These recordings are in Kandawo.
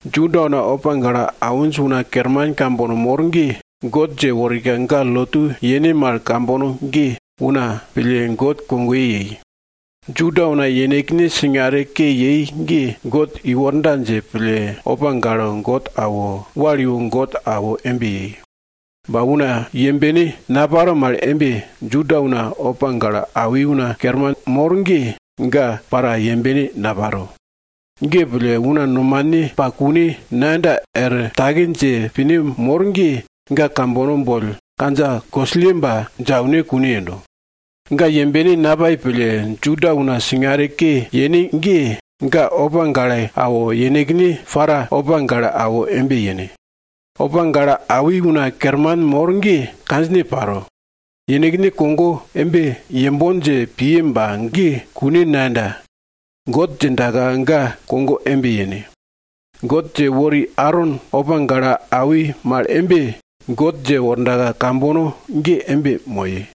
Juda una opa gale awinj una kerman kambono mor ge, God dje worika ga lotu yene mal kambono ge, una pille God kogoye yei. Juda una yenekne singare ke yei ge, God i worda dje pille opa gale God awo, wal iwo God awo embe yei. Ba una yembene naparo mal embe, Juda una opa gale awi una kerman mor ge, ga para yembene naparo. Ge pille, una nomane pa kune nayenda er take dje pine mor ge, ga kambono boll kandja kosilleba dje aune kune yendo. Ga yembene napai pille, Juda una singare ke yene ge, ga opa gale awo, yenekne pille para opa gale awo embe yene. Opa gale awi una kerman mor ge kandjine paro. Yenekne kogo embe yembon dje piye ba ge kune nayenda. God djindaka ga kogo embe yene. God dje wori Aron opa gale awi mal embe, God dje worda kambono ge embe moye.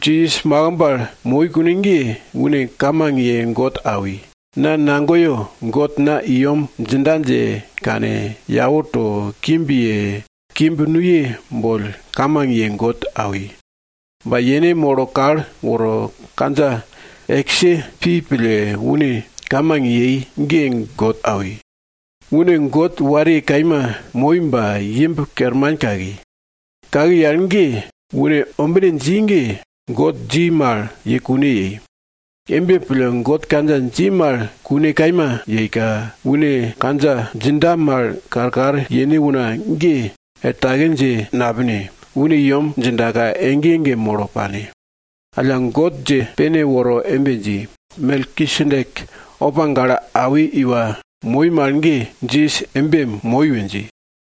Jisas makimb al moi kune ge, une kamang ye God awi. Na nagoyo, God na i yem djinda dje kane, yau to, kimb ye, kimb nuye boll kamang ye God awi. Ba yene molo kal woro kandja eske pi pille une kamang yei ge God awi. Une God wariye kaima moi ba, imb kerman kaki. Kaki al ge, une ombine dji ge, God dji mal ye kune yei. Embe pille, God kandja dji mal kune kaima yeika, une kandja djinda mal karkar yene una ge, er take dje napine, une i yem djindaka, ege ege molo pane. Alla, God dje pene woro embe dji, Melkisedek opa gale awi iwa moi mal ge, Jisas embe moi we dji.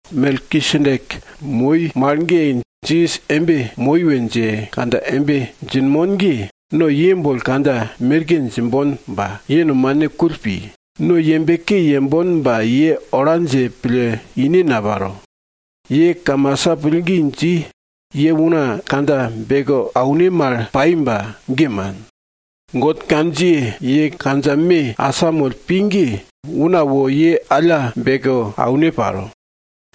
Melkisedek moi mal ge, Jisas embe moi we dje kandja embe djinmon ge, no ye boll kandja merke djimbon ba, ye nomane kull pi, no yembe ke yembon ba ye ola dje pille ine naparo. Ye kamasa pillgi dji, ye una kandja beke aune mal pai ba, ge man. God kandjiye, ye kandja me asamoll pi ge, una wo ye alla beke aune paro.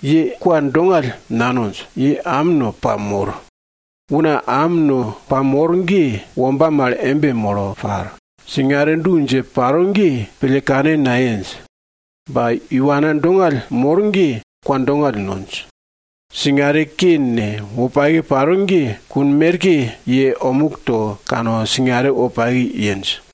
Ye kwa dongall nanonj, ye am no pamor. Una am no pamor ge, womba mal embe molo par, singare du dje paro ge, pille kane nayenj. Ba iwana dongall mor ge, kwa dongall nonj. Singare ke ne, wopake paro ge, kun merke ye omuk to kane, singare wopake yenj.